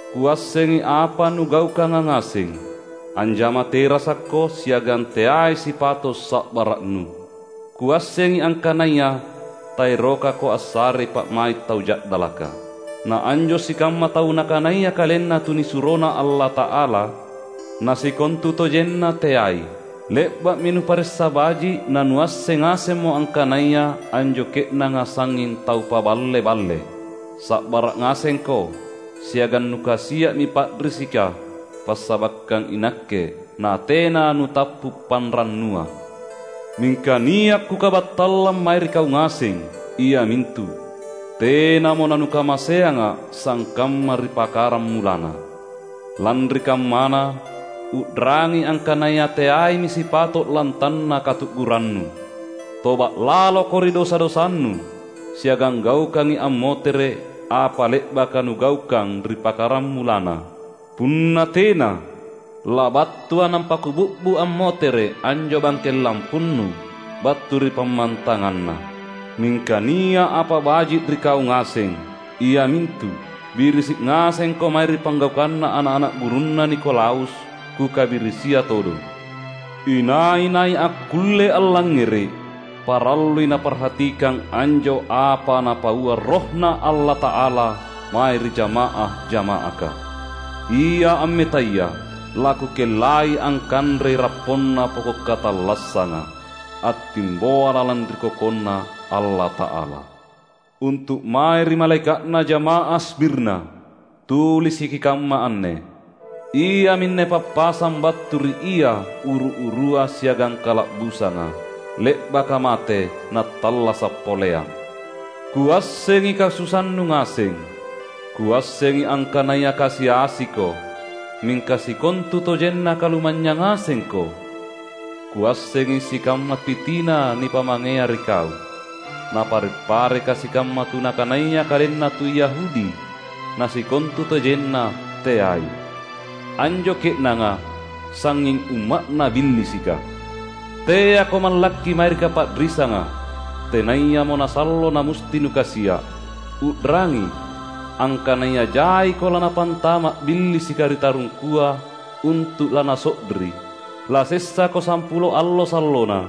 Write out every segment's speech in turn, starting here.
Kuassengi apa nugaukanga ngaseng: anjama terasakko, siagang teai sipato’ sa’bara’nu. Kuassengi angkanaya taerokako assarei pa’mai’ tau ja’dalaka. Na anjo sikamma tau nakanaya kalenna tunisuroNa Allata’ala, nasikontutojenna teai, le’ba’mi nuparessa baji’; na nuasseng ngasemmo angkanaya anjo ke’nanga sangnging tau paballe-balle. Sa’bara’ ngasengko, siagang nukasia’mi pa’risika passabakkang iNakke, na tena nutappu’ panrannuang. Mingka nia’ Kukabattallang mae ri kau ngaseng, iamintu: Tenamo nanukamaseangA’ sangkamma ri pakaramulanna. Lanri kammana, u’rangi angkanaya teaimi sipato’ lantanna katu’gurannu! Toba’ laloko ri dosa-dosanu, siagang gaukangi ammotere’ apa le’baka nugaukang ri pakaramulanna. Punna tena, labattuA’ nampa Kubi’bu’ ammotere’ anjo bangkeng lampunnu battu ri pammantanganna. Mingka nia’ apa baji’ ri kau ngaseng, iamintu: Birisi’ ngasengko mae ri panggaukanna ana’-ana’ gurunna Nikolaus, Kukabirisia todong. Inai-nai akkulle allangngere’, parallui naparhatikang anjo apa Napaua RohNa Allata’ala mae ri jama’ah-jama’aka! Ia ammetaya, laKukellai angkanrei rapponna poko’ katallassanga, attimboa lalang ri KokonNa Allata’ala." "Untu’ mae ri malaeka’na jama’ah Smirna, tulisiki kamma anne: Iaminne pappasang battu ri Ia uru-urua siagang kala’busanga, le’baka mate Nattallasa’ poleang. Kuassengi kasusannu ngaseng; Kuassengi angkanaya kasi-asiko, mingka sikontutojenna kalumanynyang ngasengko! Kuassengi sikamma pitina nipamangea ri kau, napare’-pareka sikamma tu nakanaya kalenna tu Yahudi, na sikontutojenna teai; anjo ke’nanga sangnging umma’na Billisika. Teako mallakki mae ri kapa’risanga, tenayamo nasallo namusti nukasia’. U’rangi, angkanaya jaiko lanapantama’ Billisika ri tarungkua untu’ lanaso’ri. Lasessako sampulo allo sallona.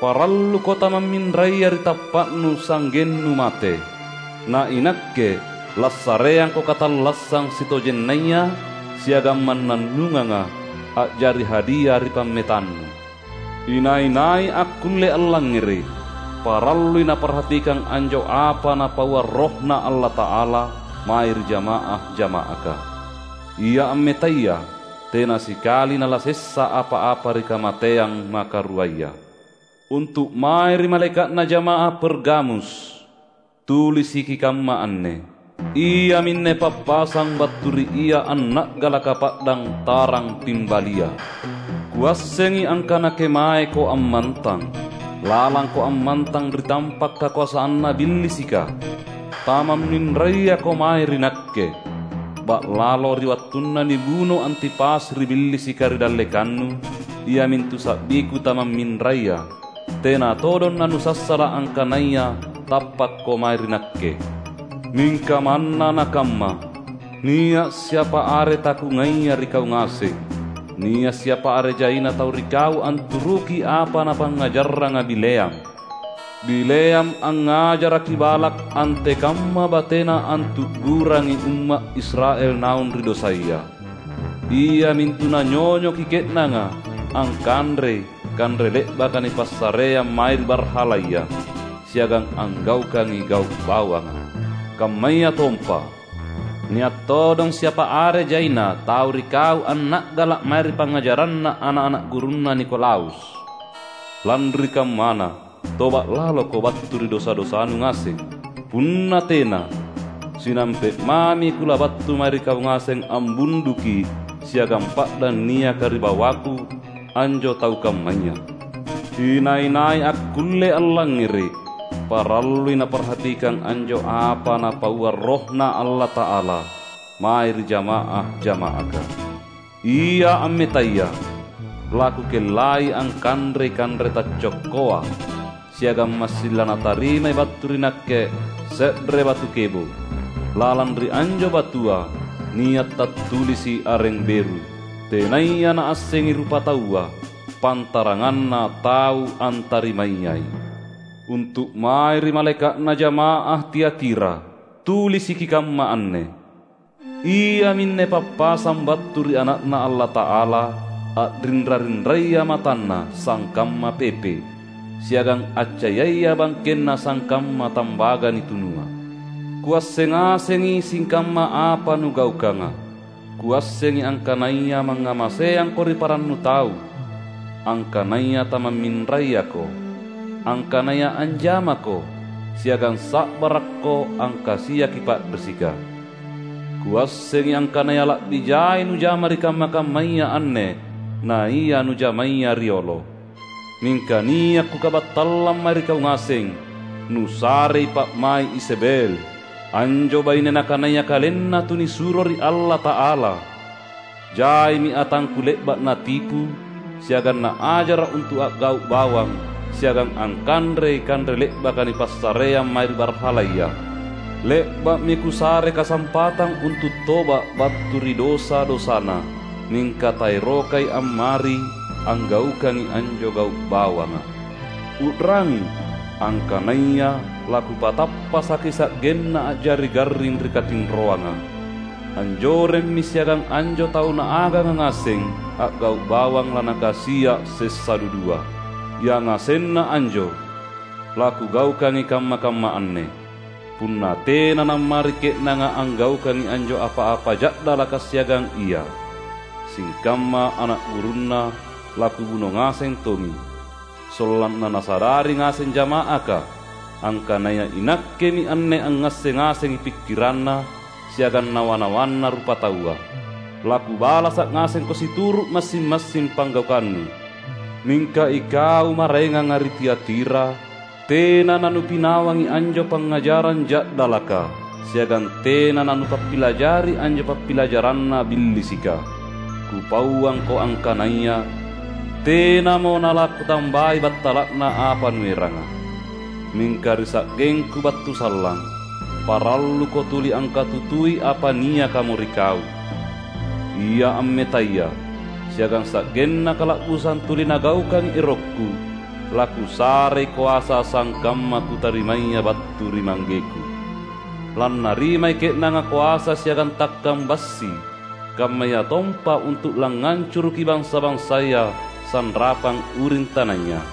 Paralluko tamamminraya ri tappa’nu sa’gennu mate; na iNakke lassareangko katallassang sitojennaya siagang mannannunganga, a’jari hadia ri pammetannu. Inai-nai akkulle allangngere’, parallui naparhatikang anjo apa Napaua RohNa Allata’ala mae ri jama’ah-jama’aka! Ia ammetaya, tena sikali nalasessa apa-apa ri kamateang makaruaya." "Untu’ mae ri malaeka’na jama’ah Pergamus, tulisiki kamma anne: Iaminne pappasang battu ri Ia anna’galaka pa’dang tarang pimbalia. Kuassengi angkana kemaeko ammantang. Lalangko ammantang ri tampa’ kakoasanna Billisika. Tamamminrayako mae ri Nakke. Ba’lalo, ri wattunna nibuno Antipas ri Billisika ri dallekannu, iamintu sa’biKu tamamminraya, tena todong nanussassala’ angkanaya tappakko mae ri Nakke. Mingka manna nakamma, nia’ siapa are taKungaia ri kau ngaseng: Nia’ siapa are jaina tau ri kau anturuki apa napangngajarranga Bileam. Bileam angngajaraki Balak antekamma batena antu’gurangi umma’ Israel naung ri dosaya; iamintu nanyonyoki ke’nanga angkanrei kanre le’baka nipassareang mae ri barhalaya, siagang anggaukangi gau’ bawanga. Kammayatompa, nia’ todong siapa are jaina tau ri kau anna’gala’ mae ri pangngajaranna ana’-ana’ gurunna Nikolaus. Lanri kammana, toba’ laloko battu ri dosa-dosanu ngaseng! Punna tena, sinampe’ mami Kulabattu mae ri kau ngaseng ambunduki siagang pa’dang niaka ri bawaKu anjo tau kammaya. Inai-nai akkulle allangngere’, parallui naparhatikang anjo apa Napaua RohNa Allata’ala mae ri jama’ah-jama’aka! Ia ammetaya, laKukellai angkanrei kanre taccokkoa; siagang massing lanatarimai battu ri Nakke se’re batu kebo’. Lalang ri anjo batua nia’ tattulisi’ areng beru, tenaya naassengi rupataua, pantaranganna tau antarimayai." "Untu’ mae ri malaeka’na jama’ah Tiatira, tulisiki kamma anne: Iaminne pappasang battu ri Ana’Na Allata’ala, a’rinra-rinraya matanNa sangkamma pepe’, siagang accayaya bangkenNa sangkamma tambaga nitunua. Kuasseng ngasengi sikamma apa nugaukanga; Kuassengi angkanaya mangngamaseangko ri parannu tau, angkanaya tamamminrayako, angkanaya anjamako, siagang sa’barakko angkasiaki pa’risika. Kuassengi angkanaya la’bi jai nujama ri kamma-kammaya anne naia nujamaya riolo. Mingka nia’ Kukabattallang mae ri kau ngaseng: Nusarei pa’mai’ Izebel, anjo baine nakanaya kalenna tunisuro ri Allata’ala. Jaimi atangKu le’ba’ natipu siagang naajara’ untu’ a’gau’ bawang siagang angkanrei kanre le’baka nipassareang mae ri barhalaya. Le’ba’mi Kusare kasampatang untu’ toba’ battu ri dosa-dosana, mingka taerokai ammari anggaukangi anjo gau’ bawanga. U’rangi! Angkanaya laKupatappasaki sa’genna a’jari garring ri katinroanga. Anjoremmi siagang anjo tau naaganga ngaseng a’gau’ bawang lanakasia’ sessa dudua. Yangasenna anjo laKugaukangi kamma-kamma anne, punna tena nammari ke’nanga anggaukangi anjo apa-apa ja’dalaka siagang ia. Sikamma ana’ gurunna laKubuno ngaseng tongi, sollanna nasadari ngaseng jama’aka angkanaya iNakkemi anne angngasseng ngasengi pikkiranna siagang nawa-nawanna rupataua. LaKubalasa’ ngasengko situru’ massing-massing panggaukannu. Mingka ikau maraenganga ri Tiatira tena nanupinawangi anjo pangngajarang ja’dalaka, siagang tena nanupappilajari anjo pappilajaranna Billisika. Kupauangko angkanaya tenamo nalaKutambai battala’na apa nueranga. Mingka ri sa’gengKu battu sallang, paralluko tuli angkatutui apa niakamo ri kau. Ia ammetaya, siagang sa’genna kala’busang tuli nagaukangi erokKu, laKusarei koasa sangkamma Kutarimaya battu ri ManggeKu. Lannarimai ke’nanga koasa siagang takkang bassi; kammayatompa untu’ langngancuruki bansa-bansaya sanrapang uring tanaya.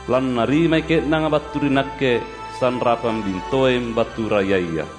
Lannarimai ke’nanga battu ri Nakke sanrapang bintoeng battu rayaya.